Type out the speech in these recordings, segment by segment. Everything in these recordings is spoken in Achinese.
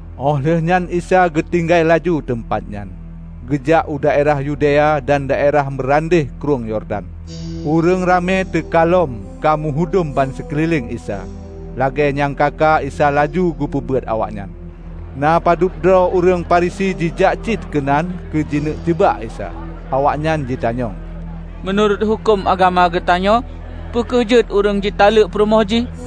Óh lheueh nyan Isa geutinggai laju teumpat nyan, geujak u daerah Yudea dan daerah meurandeh Krueng Yordan. Ureuëng ramé teuka lom ka meuhudom bansikeulileng Isa. Lagée nyang ka-ka Isa laju geupeubeuet awaknyan. Na padub droe ureuëng Farisi jijak cit keunan keu jikeuneuk jeubak Isa. Awaknyan jitanyong, "Meunurot huköm agama geutanyoe, peu kheueh jeuet ureuëng jitaleuek peurumoh jih?"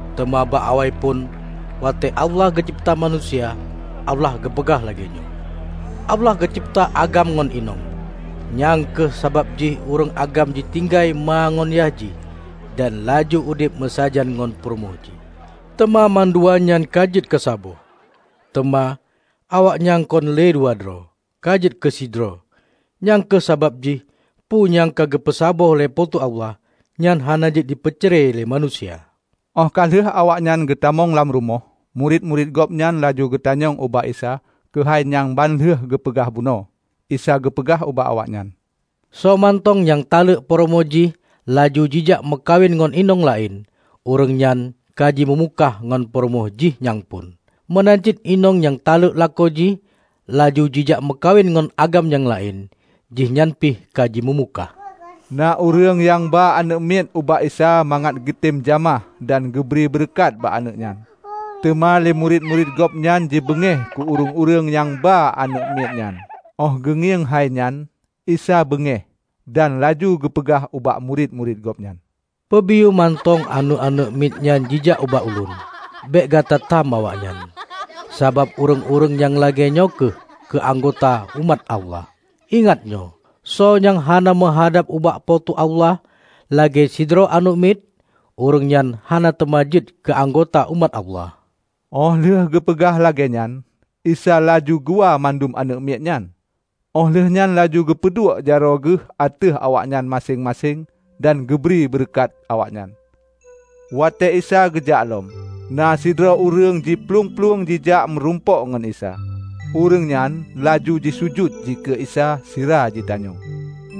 "Teuma bak awaiphon, watée Allah geucebta manusia, Allah geupeugah lagée nyoe, 'Allah geucebta agam ngon inong. Nyang kheueh sabab jih ureuëng agam jitinggai ma ngon yah jih dan laju udeb meusajan ngon peurumoh jih, teuma mandua nyan ka jeuet keusaboh, teuma, awaknyan kon le dua droe, ka jeuet keu sidroe.' Nyang kheueh sabab jih, peue nyang ka geupeu saboh lé Po teu Allah, nyan hana jeuet jipeucre lé manusia!" Óh ka lheueh awaknyan geutamong lam rumoh, murit-murit Gobnyan laju jitanyong ubak Isa keuhai nyang ban lheueh geupeugah bunoe. Isa geupeugah ubak awaknyan, "Soe mantong nyang taleuek peurumoh jih laju jijak meukawen ngon inong laén, ureuëng nyan ka jimeumukah ngon peurumoh jih nyang phon. Meunan cit inong nyang taleuek lakoe jih laju jijak meukawen ngon agam nyang laén, jihnyan pih ka jimeumukah." Na ureuëng nyang ba aneuëk miet ubak Isa mangat geutem jamah dan geubri beureukat bak aneuëk nyan. Teuma lé murit-murit Gobnyan jibeungéh keu ureuëng-ureuëng nyang ba aneuëk miet nyan. Óh geungieng hai nyan, Isa beungéh dan laju geupeugah ubak murit-murit Gobnyan, "Peubiyeu mantong aneuëk-aneuëk miet nyan jijak ubak Ulôn! Bék gata tam awaknyan, sabab ureuëng-ureuëng nyang lagée nyoe kheueh keu anggota umat Allah. Ingat nyoe! Soe nyang hana meuhadab ubak Po teu Allah lagée sidroe aneuëk miet, ureuëng nyan hana teuma jeuet keu anggota umat Allah." Óh lheueh geupeugah lagée nyan, Isa laju geuwa mandum aneuëk miet nyan, óh lheueh nyan laju geupeuduek jaroe Geuh ateueh awaknyan maséng-maséng dan geubri beureukat awaknyan. Watée Isa geujak lom, na sidroe ureuëng jiplueng-plueng jijak meurumpok ngon Isa. Ureuëng nyan laju jisujut dikeue Isa sira jitanyong,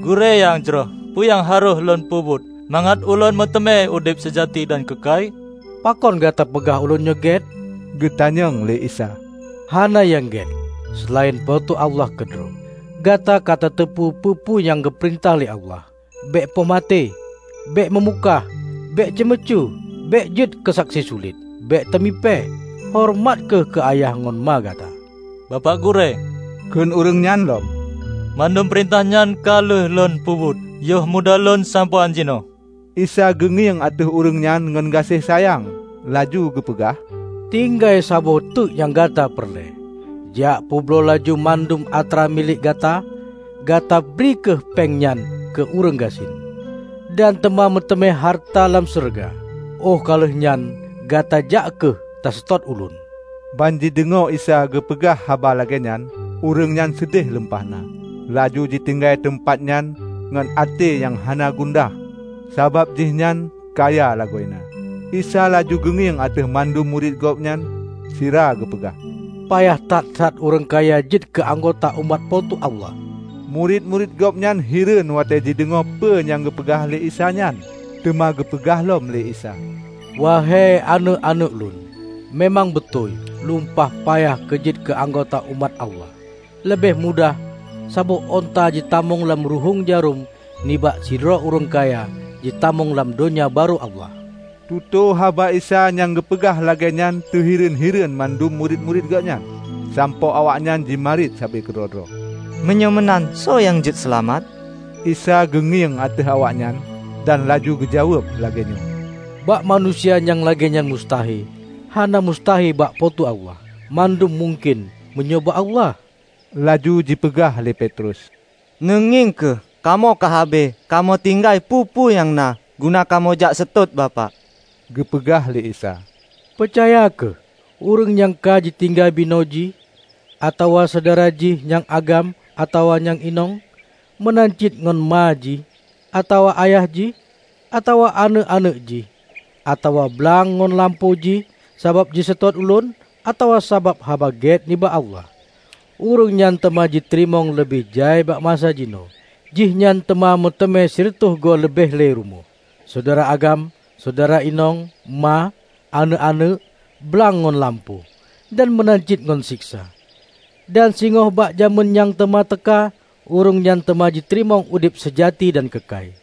"Gurée nyang jroh, peue nyang harôh lôn peubuet mangat ulôn meuteumé udeb seujati dan keukai?" "Pakon gata peugah Ulôn nyoe gét?" geutanyong lé Isa. "Hana nyang gét, seulaén Po teu Allah keudroe. Gata katateupeu peue-peue nyang geupeurintah lé Allah, 'Bék poh maté, bék meumukah, bék ceumeucue, bék jeuet keusaksi sulet, bék teumipée, horeumat kheueh keu yah ngon ma gata.' " "Bapak Gurée," kheun ureuëng nyan lom, "Mandum peurintah nyan ka lheueh lôn peubuet yoh muda lôn sampoe án jinoe." Isa geungieng ateueh ureuëng nyan ngon gaséh sayang laju geupeugah, "Tinggai saboh teuk nyang gata peureulée. Jak peubloe laju mandum atra milék gata; gatabri kheueh péng nyan keu ureuëng gasien, dan teuma meuteumé hareuta lam syeuruga. Óh ka lheueh nyan gata jak kheueh taseutôt Ulôn." Ban jideungoe Isa geupeugah haba lagée nyan, ureuëng nyan seudeh lumpah na, laju jitinggai teumpat nyan ngon até nyang hana gundah sabab jihnyan kaya lagoena. Isa laju geungieng ateueh mandum murit Gobnyan sira geupeugah, "Payah that-that ureuëng kaya jeuet keu anggota umat Po teu Allah!" Murit-murit Gobnyan hireuen watée jideungoe peue nyang geupeugah lé Isa nyan. Teuma geupeugah lom lé Isa, "Wahei aneuëk-aneuëk Lôn, meumang beutôi lumpah payah keu jeuet keu anggota umat Allah! Leubeh mudah saboh unta jitamong lam ruhuéng jarôm nibak sidroe ureuëng kaya jitamong lam Donya Barô Allah." Tutoe haba Isa nyang geupeugah lagée nyan teuhireuen-hireuen mandum murit-murit Gobnyan sampoe awaknyan jimarit sabe keudroe-droe, "Meunyoe meunan, soe nyang jeuet seulamat?" Isa geungieng ateueh awaknyan dan laju geujaweueb lagée nyoe, "Bak manusia nyang lagée nyan mustahe, hana mustahe bak Po teu Allah; mandum mungken meunyoe bak Allah." Laju jipeugah lé Petrus, "Neungieng kheueh, kamoe ka habéh kamoe tinggai peue-peue nyang na guna kamoe jak seutôt Bapak." Geupeugah lé Isa, "Peucaya kheueh: ureuëng nyang ka jitinggai binoe jih, atawa syedara jih nyang agam atawa nyang inong, meunan cit ngon ma jih, atawa ayah jih, atawa aneuëk-aneuëk jih, atawa blang ngon lampôh jih sabab jiseutôt Ulôn atawa sabab Haba Gét nibak Allah, ureuëng nyan teuma jiteurimong leubeh jai bak masa jinoe. Jihnyan teuma meuteumé sireutôh goe leubeh le rumoh, syedara agam, syedara inong, ma, aneuëk-aneuëk, blang ngon lampôh, -- dan meunan cit ngon seksa. Dan singoh bak jamén nyang teuma teuka, ureuëng nyan teuma jiteurimong udeb seujati dan keukai.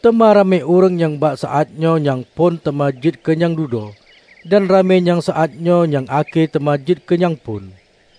Teuma ramé ureuëng nyang bak saát nyoe nyang phon teuma jeuet keu nyang dudoe dan ramé nyang saát nyoe nyang akhé teuma jeuet keu nyang phon."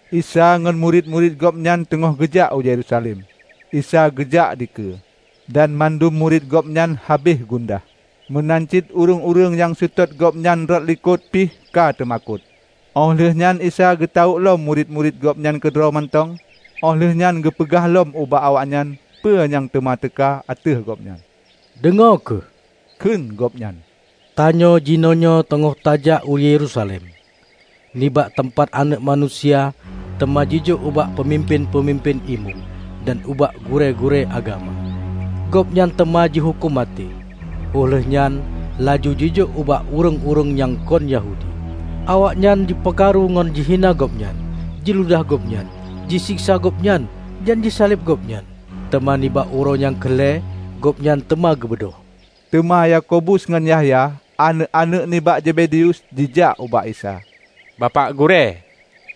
Isa ngon murit-murit Gobnyan teungoh geujak u Yerusalem, Isa geujak dikeue, dan mandum murit Gobnyan habéh gundah. Meunan cit ureuëng-ureuëng nyang seutôt Gobnyan rot dilikot pih ka teumakot. Óh lheueh nyan Isa geutawök lom murit-murit Gobnyan keudroe mantong óh lheueh nyan geupeugah lom bak awaknyan peu nyang teuma teuka ateueh Gobnyan. "Deungoe kheueh," kheun Gobnyan, "Tanyoe jinoenyoe teungoh tajak u Yerusalem. Nibak teumpat Aneuëk Manusia teuma jijok ubak peumimpén-peumimpén imeum dan ubak gurée-gurée agama. Gobnyan teuma jihuköm maté, óh lheueh nyan laju jijok ubak ureuëng-ureuëng nyang kon Yahudi. Awaknyan teuma ji peukaru ngon jihina Gobnyan, jiludah Gobnyan, jiseksa Gobnyan, dan jisaleb Gobnyan. Teuma nibak uroe nyang keu lhée Gobnyan teuma geubeudôh." Teuma Yakobus ngon Yahya, aneuëk-aneuëk nibak Zebedeus, jijak ubak Isa, "Bapak Gurée,"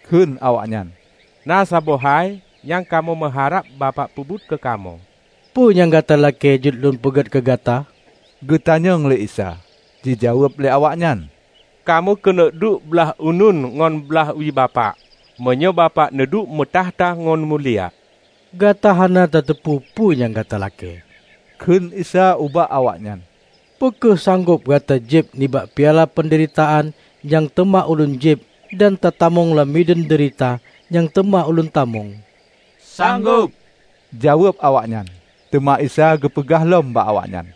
kheun awaknyan, "Na saboh hai nyang kamoe meuharab Bapak peubuet keu kamoe." "Peue nyang gata lakée jeuet lôn peuget keu gata?" geutanyong lé Isa. Jijaweueb lé awaknyan, "Kamoe keuneuk duek blaih uneun ngon blaih wie Bapak, meunyoe Bapak neuduek meutakhta ngon mulia." "Gata hana tateupeue peue nyang gata lakée," kheun Isa ubak awaknyan, "Peu kheueh sanggob gata jieb nibak piala peundeuritaan nyang teuma Ulôn jieb dan tatamong lam mideuen deurita nyang teuma Ulôn tamong?" "Sanggob," jaweueb awaknyan. Teuma Isa geupeugah lom bak awaknyan,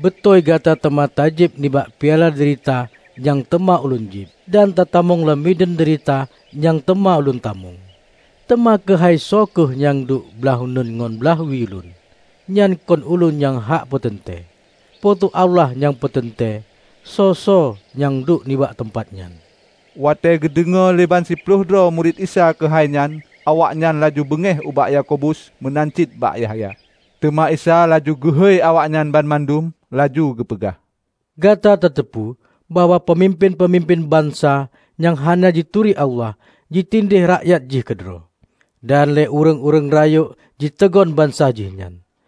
"Beutôi gata teuma tajieb nibak piala deurita nyang teuma Ulôn jieb, dan tatamong lam mideuen deurita nyang teuma Ulôn tamong. Teuma keuhai soe kheueh nyang duek blaih uneun ngon blaih wie lôn, nyan kon ulôn nyang hak peuteuntée. Po teu Allah nyang peuteuntée soe-soe nyang duek nibak teumpat nyan." Watée geudeungoe lé ban siploh droe murit Isa keuhai nyan, awaknyan laju beungéh ubak Yakobus meunan cit bak Yahya. Teuma Isa laju geuhôi awaknyan banmandum, laju geupeugah, "Gata tateupeue bahwa peumimpén-peumimpén bansa nyang hana jituri Allah jitindéeh rakyat jih keudroe. Dan lé ureuëng-ureuëng rayeuk jiteugon bansa jih nyan.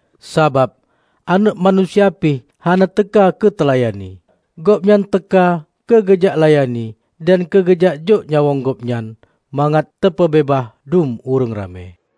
Sabab, Aneuëk Manusia pih hana teuka keuteulayani. Gobnyan teuka keu geujak layani dan keugeujak jok nyawöng Gobnyan mangat teupeubeubaih dum ureuëng ramé."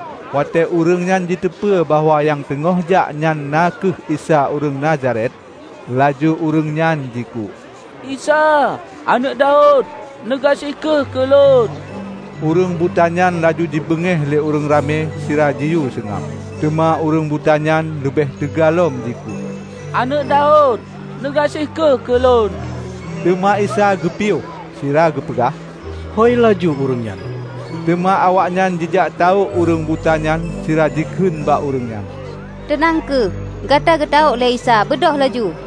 Watée ureuëng nyan jiteupeu bahwa nyang teungoh jak nyan na kheueh Isa ureuëng Nazaret, laju ureuëng nyang jikuk, "Isa, Aneuëk Daud! Neugaséh kheueh keu lôn!" Ureuëng buta nyan laju jibeungéh le ureuëng ramé sira jiyue seungab. Teuma ureuëng buta nyan leubeh teuga lom jikuk, "Aneuëk Daud, neugaséh kheueh keu lôn!" Teuma Isa geupiôh sira geupeugah, "Hôi laju ureuëng nyan." Teuma awaknyan jijak tawök ureuëng buta nyan sira jikheun bak ureuëng nyan, "Teunang kheueh! Gata geutawök lé Isa, beudôh laju!"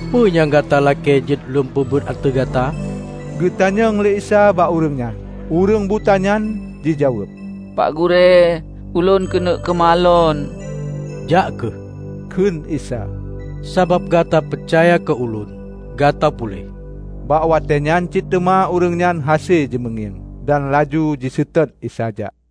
"Peue nyang gata lakée jeuet Lôn peubuet ateueh gata?" Geutanyong lé Isa bak ureuëng nyan. Ureuëng buta nyan jijaweueb, "Pak Gurée, ulôn keuneuk keumalon." "Jak kheueh," kheun Isa, "sabab gata peucaya keu Ulôn, gata puléh." Bak watéenyan cit teuma ureuëng nyan hase jimeungieng, dan laju jiseutôt Isa jak.